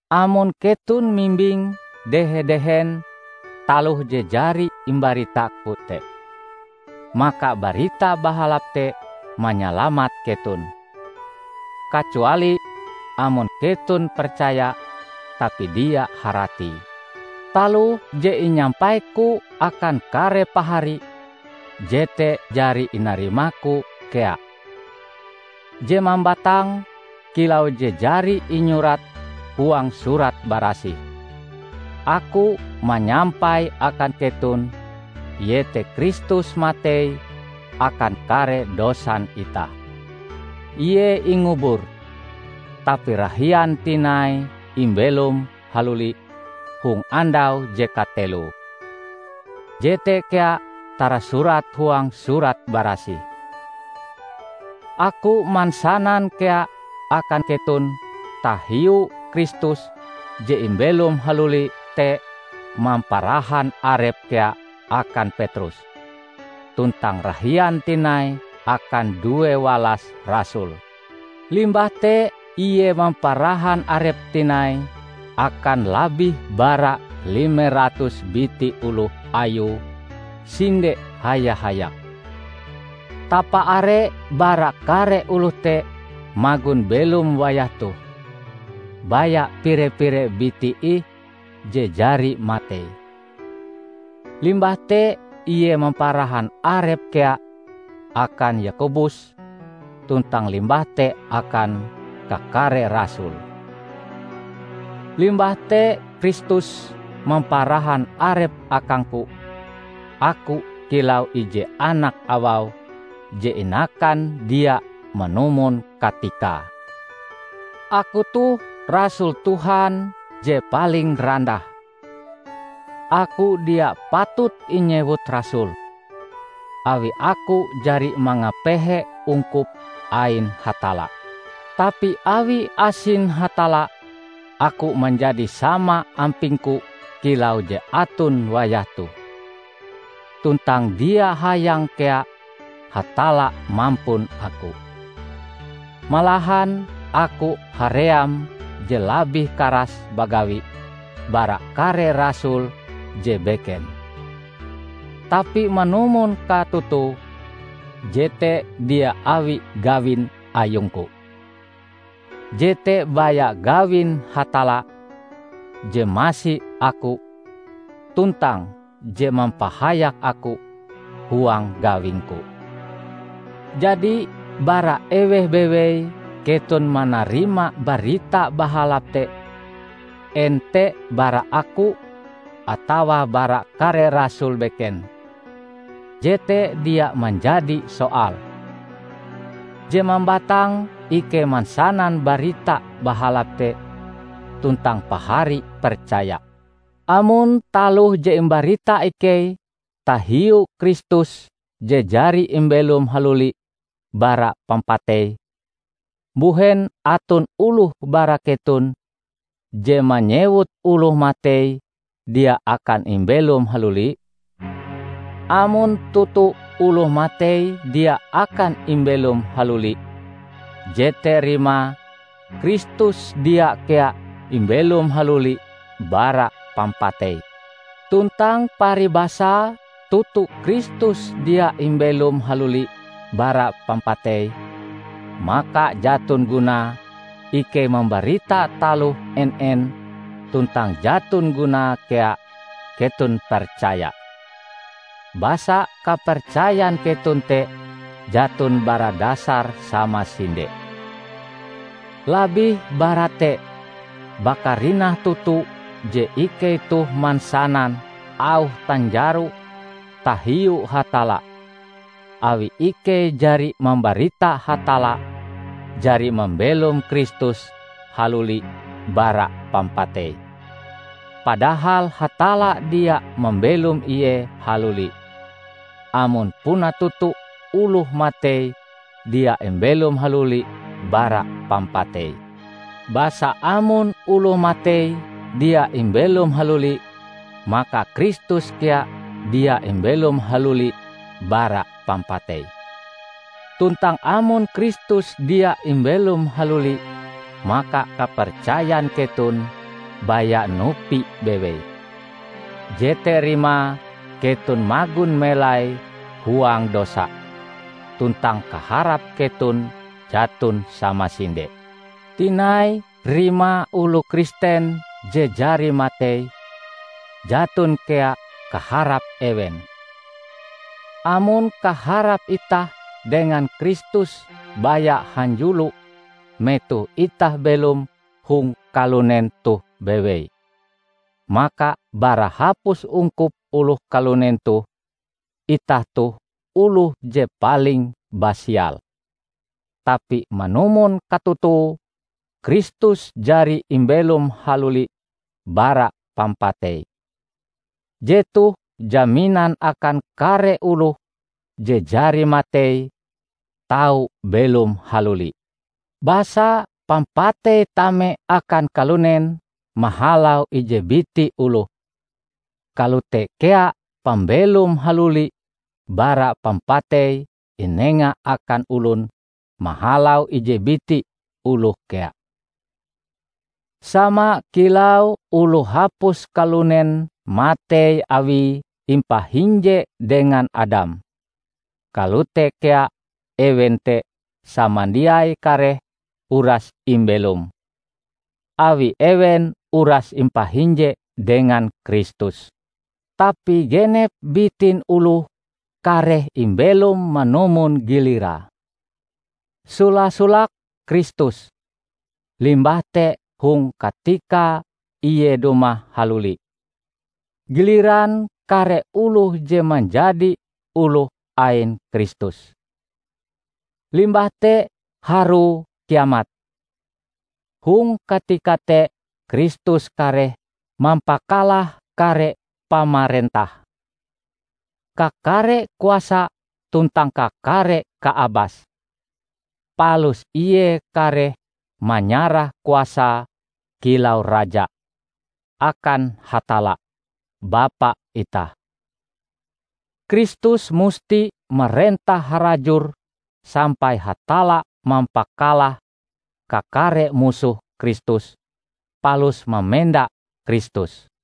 Amon keton mimbing dehe-dehen taloh je jari imbaritaku te, maka Barita Bahalap te manyalamat keton; kacuali amon keton percaya tapi dia haratie. Taloh je inyampaiku akan kare pahari jete jari inarimaku kea. Je mambatang, kilau je jari inyurat huang Surat Barasih, aku manyampai akan keton iete Kristus matei akan kare dosan itah; Ie ingubur, tapi rahian tinai imbelom haluli hong andau je kateloe. Jete kea tarasurat huang Surat Barasih. Aku mansanan kea akan keton tahiu Kristus je imbelom haluli te mamparahan Arep kea akan Petrus, tuntang rahian tinai akan due walas rasul. Limbah te Ie mamparahan Arep tinai akan labih bara lime ratus biti oloh Ayue sinde haya-hayak. Tapaare bara kare oloh te magon belom wayah toh, baya pire-pire biti ih je jari matei. Limbah te Ie mamparahan Arep kea akan Yakobus tuntang limbah te akan kakare rasul. Limbah te Kristus mamparahan Arepe akangku -- aku kilau ije anak awau je inakan dia manumon katikae! Aku toh rasul Tuhan je paling randah. Aku dia patut inyewut rasul, awi aku jari mangapehe ungkup ain Hatalla. Tapi awi asin Hatalla, aku manjadi sama ampingku kilau je aton wayah toh. Tuntang dia hayang kea Hatalla mampun aku. Malahan aku haream je labih karas bagawi bara kare rasul je beken. Tapi manumon katotoe, jete dia awi gawin ayungku; jete baya gawin Hatalla je masi aku tuntang je mampahayak aku huang gawingku. Jadi bara eweh bewei keton manarima Barita Bahalap te -- en te bara aku atawa bara kare rasul beken -- jete dia manjadi soal. Je mambatang ikei mansanan Barita Bahalap te tuntang pahari percaya. Amon taloh je imbarita ikei tahiu Kristus je jari imbelom haluli bara pampatei, mbuhen aton oloh bara keton je manyewut oloh matei dia akan imbelom haluli? Amon toto oloh matei dia akan imbelom haluli, jete rimae Kristus dia kea imbelom haluli bara pampatei. Tuntang paribasae toto Kristus dia imbelom haluli bara pampatei, maka jaton gunae ikei mambarita taloh en-en tuntang jaton gunae kea keton percaya, basa kapercayan keton te jaton bara dasar samasinde. Labih bara te, bakarinah toto je ikei toh mansanan auh tanjaro tahiu Hatalla awi ikei jari mambarita Hatalla jari mambelom Kristus haluli bara pampatei, padahal Hatalla dia mambelom ie haluli -- amon puna toto oloh matei dia imbelom haluli bara pampatei. Basa amon oloh matei dia imbelom haluli, maka Kristus kea dia imbelom haluli bara pampatei. Tuntang amon Kristus dia imbelom haluli maka kapercayan keton baya nupi bewei; jete rimae keton magon melai huang dosa tuntang kaharap keton jaton samasinde. Tinai, rimae oloh Kristen je jari matei, jaton kea kaharap ewen. Amon kaharap itah dengan Kristus baya hanjulo metoh itah belom hong kalunen toh bewei, maka bara hapus ungkup oloh kalunen toh, itah toh oloh je paling basial! Tapi manumon katotoe Kristus jari imbelom haluli bara pampatei. Jetoh jaminan akan kare oloh je jari matei tau belom haluli. Basa pampatei tame akan kalunen mahalau ije biti oloh, kalote kea pambelom haluli bara pampatei inenga akan olon mahalau ije biti oloh kea. Sama kilau oloh hapus kalunen matei awie impahinje dengan Adam, kalote kea ewen te samandiai kareh uras imbelom, awi ewen uras impahinje dengan Kristus. Tapi genep bitin oloh kareh imbelom manumon gilirae: sola-solake Kristus; limbah te hong katika ie dumah haluli, giliran kare oloh je manjadi oloh ain Kristus. Limbah te harue Kiamat. Hong katika te Kristus kareh mampakalah kare pamarentah, kakare kuasa tuntang kakare kaabas; palus ie kareh manyarah kuasae kilau Raja, akan Hatalla, Bapa itah. Kristus musti marentah harajur sampai Hatalla mampakalah kakare musoh Kristus palus mamenda Kristus.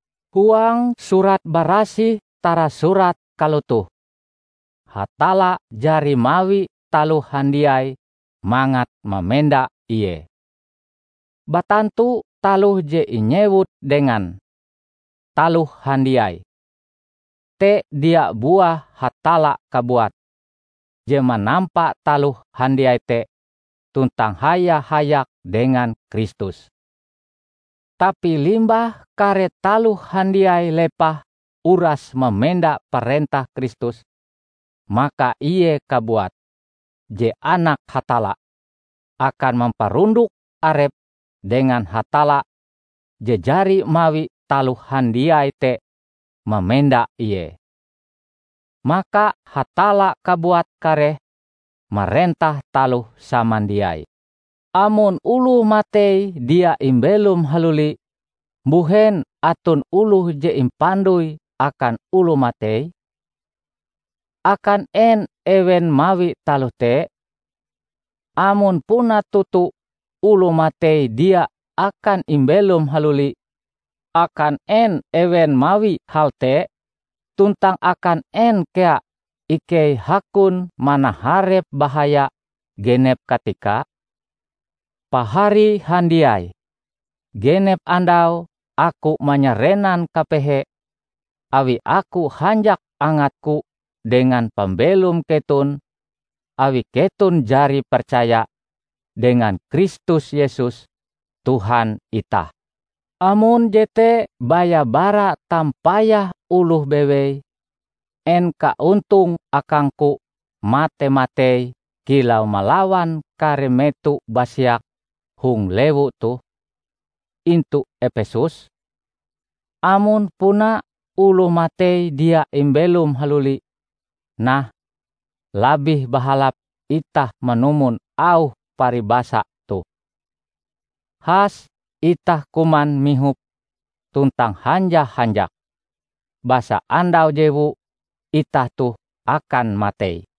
Huang Surat Barasih tarasurat kalotoh, "Hatalla jari mawi taloh handiai mangat mamenda Ie." Batantu taloh je inyewut dengan "taloh handiai" te dia buah Hatalla kabuat, je manampa taloh handiai te tuntang haya-hayak dengan Kristus. Tapi limbah kare taloh handiai lepah uras mamenda parentah Kristus, maka Ie kabuat, je Anak Hatalla, akan mamparundok arepe dengan Hatalla je jari mawi taloh handiai te mamenda Ie. Maka Hatalla kabuat kareh marentah taloh samandiai. Amon oloh matei dia imbelom haluli, mbuhen aton oloh je impandoi akan oloh matei? Akan en ewen mawi taloh te? Amon puna toto oloh matei dia akan imbelom haluli, akan en ewen mawi hal te? Tuntang akan en kea ikei hakon manaharep bahaya genep katika? Pahari handiai! Genep andau aku manyarenan kapehe awi aku hanjak angatku dengan pambelom keton awi keton jari percaya dengan Kristus Yesus, Tuhan itah. Amon jete baya bara tampayah oloh bewei, en kaontonge akangku mate-matei kilau malawan kare meto basiak hong lewu toh, intu Epesus? Amon puna oloh matei dia imbelom haluli, nah, labih bahalap itah manumon auh paribasa toh: "Has itah kuman mihop tuntang hanja-hanjak, basa andau jewu itah toh akan matei."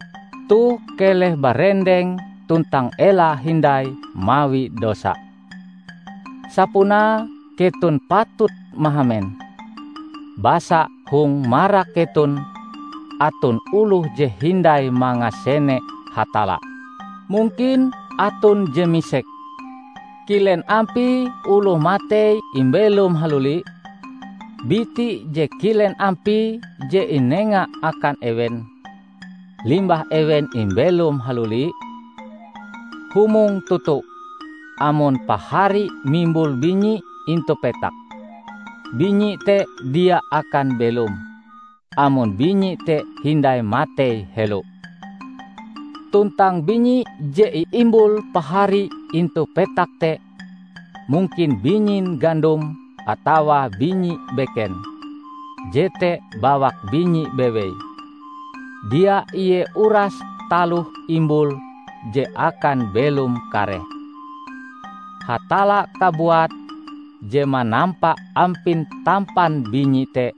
Toh keleh barendeng tuntang ela hindai mawi dosa. Sapunae keton patut mahamen, basa hong marak keton aton oloh je hindai mangasene Hatalla. Mungkin aton je misek, "Kilen ampie oloh matei imbelom haluli? Biti je kilen ampie je inenga akan ewen, limbah ewen imbelom haluli?" Humong toto! Amon pahari mimbul binyi intu petak, binyi te dia akan belom, amon binyi te hindai matei helo. Tuntang binyi je iimbul pahari intu petak te -- mungkin binyin gandom atawa binyi beken -- jete bawak binyi bewei, dia ie uras taloh imbul je akan belom kareh. Hatalla kabuat je manampa ampin tampan binyi te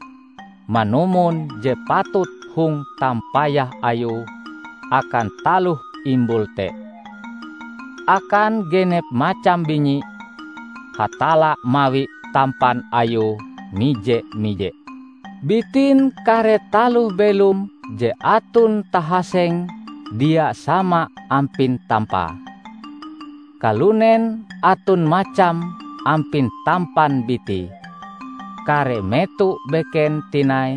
manumon je patut hong tampayah Ayue akan taloh imbul te. Akan genep macam binyi, Hatalla mawi tampan ayue mije-mije. Bitin kare taloh belom je aton tahasenge dia sama ampin tampae. Kalunen aton macam ampin tampan bitie, kare meto beken tinai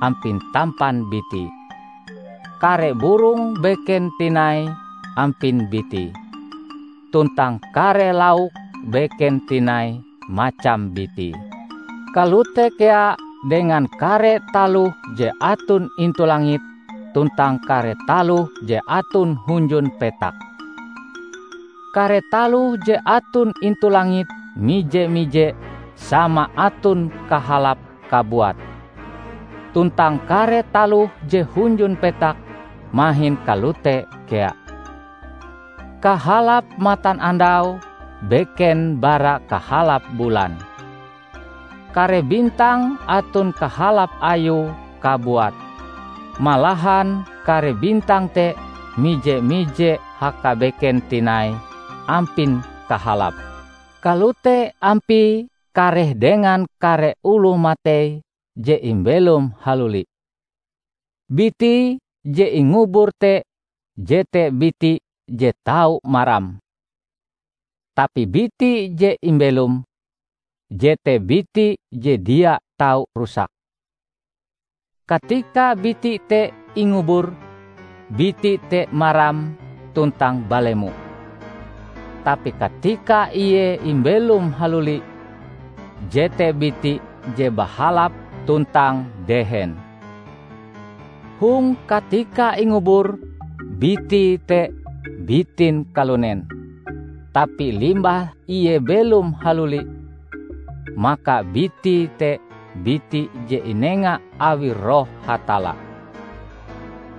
ampin tampan bitie, kare burong beken tinai ampin bitie, tuntang kare lauk beken tinai macam bitie. Kalote kea dengan kare taloh je aton intu langit tuntang kare taloh je aton hunjun petak. Kare taloh je aton intu langit mije-mije sama aton kahalape kabuat, tuntang kare taloh je hunjun petak mahin kalote kea. Kahalap matanandau beken bara kahalap bulan. Kare bintang aton kahalap ayue kabuat. Malahan kare bintang te mije-mije hakabeken tinai ampin kahalape. Kalote ampie kareh dengan kare oloh matei je imbelom haluli. Bitie je ingubur te jete biti je tau maram, tapi biti je imbelom, jete biti je dia tau rusak. Katika biti te ingubur, biti te maram tuntang balemo; tapi katika ie imbelom haluli, jete biti je bahalap tuntang dehen. Hong katika ingubur, bitie te bitin kalunen; tapi limbah ie belom haluli, maka bitie te biti je inenga awi Roh Hatalla.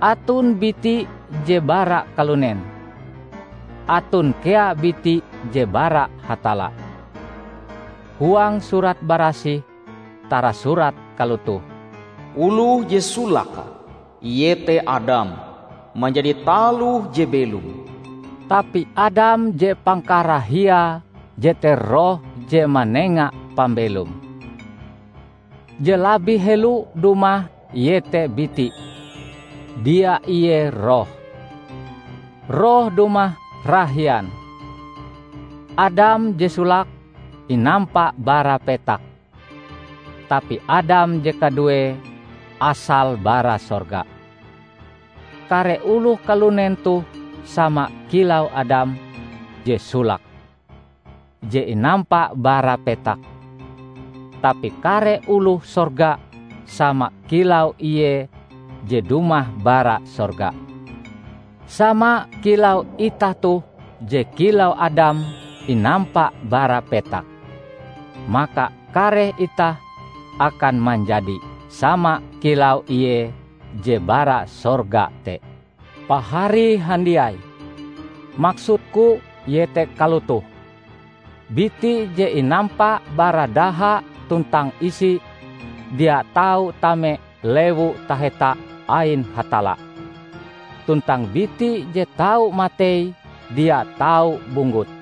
Aton biti je bara kalunen, aton kea biti je bara Hatalla. Huang Surat Barasih tarasurat kalotoh, "Oloh je solake, iete Adam, manjadi taloh je belom," tapi Adam je pangkarahiae jete Roh je manenga pambelom. Je labih helo dumah iete biti, dia ie roh. Roh dumah rahian. Adam je solake inampa bara petak, tapi Adam je kaduee asale bara sorga. Kare oloh kalunen toh sama kilau Adam je solake, je inampa bara petak, tapi kare oloh sorga sama kilau Ie je dumah bara sorga. Sama kilau itah toh je kilau Adam inampa bara petak, maka kareh itah akan manjadi. sama kilau Ie je bara sorga te. Pahari handiai! Maksudku iete kalotoh: biti je inampa bara daha tuntang isi, dia tau tame Lewu Taheta ain Hatalla; tuntang biti je tau matei dia tau bunggut.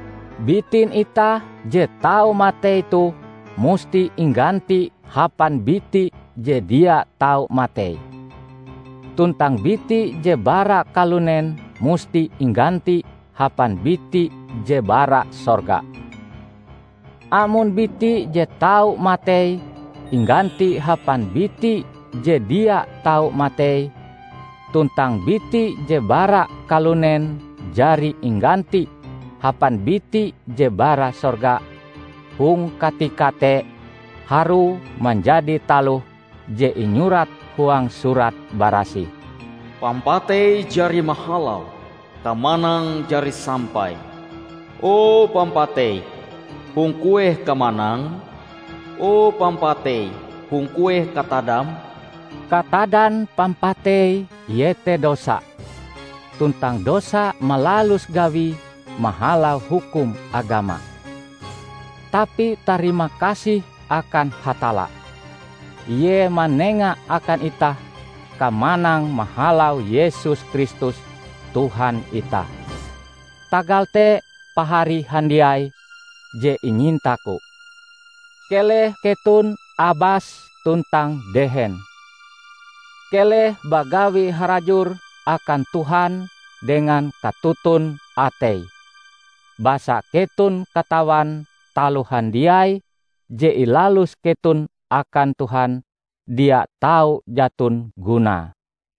Bitin itah je tau matei toh musti ingganti hapan biti je dia tau matei, tuntang biti je bara kalunen musti ingganti hapan biti je bara sorga. Amon biti je tau matei ingganti hapan biti je dia tau matei, tuntang biti je bara kalunen jari ingganti hapan biti je bara sorga, hong katika te harue manjadi taloh je inyurat huang Surat Barasih, "Pampatei jari mahalau; kamanang jari sampai!" "O pampatei, hong kueh kamanangm? O pampatei hong kueh katadam?" Katadan pampatei iete dosa, tuntang dosa malalus gawie mahalau hukum agama. Tapi tarimakasih akan Hatalla; Ie manenga akan itah kamanang mahalau Yesus Kristus Tuhan itah! Tagal te pahari handiai je inyintaku, keleh keton abas tuntang dehen. Keleh bagawi harajur akan Tuhan dengan katoton atei, basa keton katawan taloh handiai je ilalus keton akan Tuhan, dia tau jaton gunae.